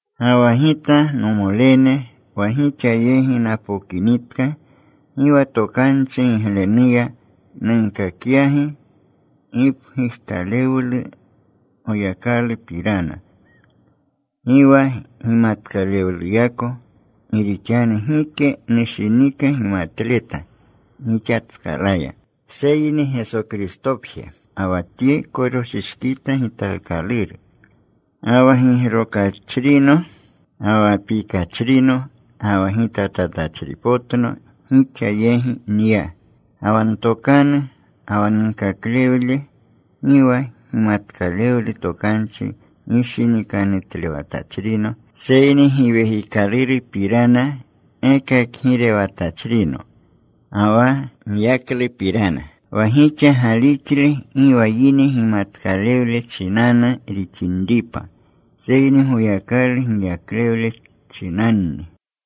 Ga wa gita, nomolene, wa gixa yegi napokinitka, gi wa tokanchi giglenuya nunkakyagi gipgujtalewlu Goyakalupirana, gi wa gimatkalewluyako. Gi rixanu gike nushinika gimatleta gixatskalaya, seyni Geso Kristopje, ga wa Tye koroshishkita gitaakaluru. Ga wa gigrokachrino, ga wa pikachrino, ga wa gitatatachripotno gixa yegi nya. Ga wa ntokanu ga wa nunkaklewle gi wa gimatkalewlu tokanchi gishinikanutlewatachrino, seyni Giwekikalurupirana gekakgirewatachrino ga wa giyaklupirana. Wa gixa galixle gi wa yine gimatkalewle chinanu rixinripa, seyni Goyakalu giyaklewle chinanni.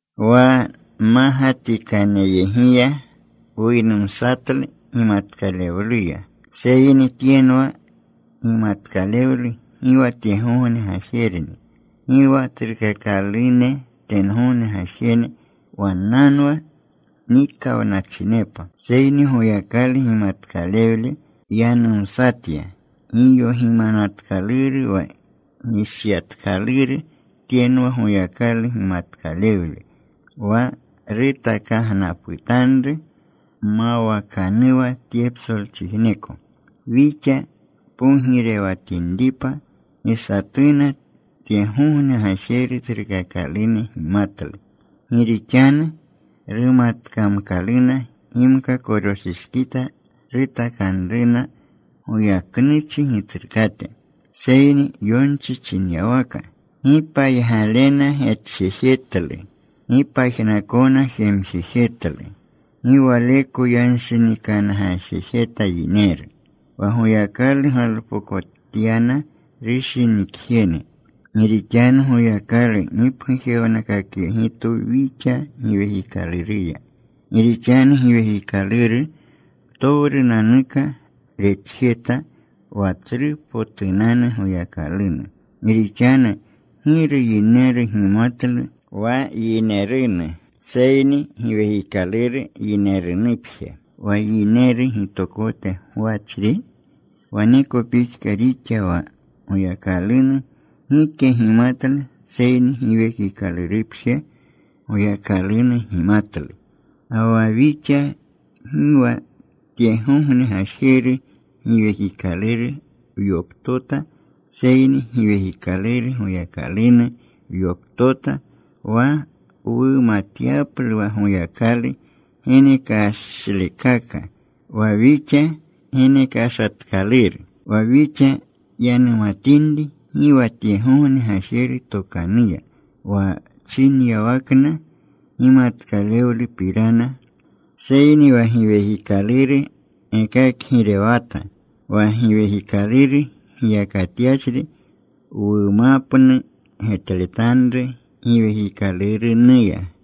Wa mmagatikaneyegiya wuynumsatlu gimatkalewluya, seyni tyenwa gimatkalewlu gi wa tyegogne gajerni, gi wa tsrukakalunenu tyegogne gajene. Wannanwa nikawnachinepa. Seyni Goyakalu gimatkalewle wyanumsatya giyogimanatkaluru, wa gishyatkaluru. Tyenwa, Goyakalu gimatkalewle wa rutakagnaputanru mawakanuwa tye psolchijneko, wixa pogirewatinripa. Gi satuna tyegogne gajeru tsrukakalune gimatlu. Gi rixanu rumatkamkaluna, gimka koroshishkita rutakanruna goyaknuchi Gitsrukate. Seyni yonchi chinyawaka: Gi paygalena getjejetlu, Gi pajnakona jemjejetlu, gi waleko yanshinikangaajejeta yineru, Wa Goyakalu galpokotyana rushinikjene. Gi rixanu Goyakalu gipgujewnakakyegitwu wixa Giwekikaluruya. Gi rixanu Giwekikaluru ptowrunanuka retjeta, wa tsrupotunanu Goyakalunu. Gi rixanu ¿giru yineru gimatlu wa yinerunu, seyni giwekikaluru yinerunupje, wa yineru gitokote gwachri? Waneko pixka rixa. Wa Goyakalunu gike gimatlu, seyni Giwekikalurupje Goyakalunu gimatlu. Ga wa wixa gi wa tyegogne gajeru giwekikaluru wyoptota, seyni Giwekikaluru Goyakalunu wyoptota, wa wumatyaplu wa Goyakalu genekashlekaka, wa wixa genekashatkaluru. Wa wixa yanumatinri, gi wa tyegogne gajene tokanuya, wa chinyawakna gimatkalewlupirana, seyni wa Giwekikaluru gekakgirewata. Wa Giwekikaluru giyakatyachri wumapnu getletanru Giwekikalurunuya.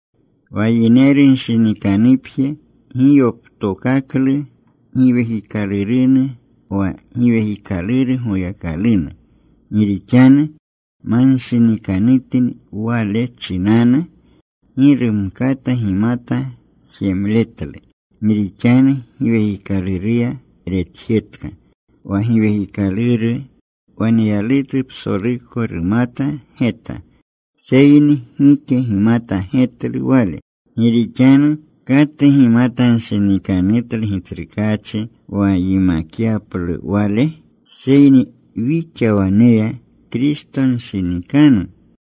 Wa yinerunshinikanupje gi yoptokaklu Giwekikalurunu wa Giwekikaluru Goyakalunu, gi rixanu manshinikanutni wale chinanu. Gi rumkata gimata jemletlu, gi rixanu Giwekikaluruya retjetka. Wa Giwekikaluru waneyalutu psoluko rumata geta. Seyni gike gimata getlu wale. Gi rixanu ¿katu gimatanshinikanutlu Gitsrukaachi, wa yimakyaplu Wale? Seyni wixa waneya Kristonshinikannu.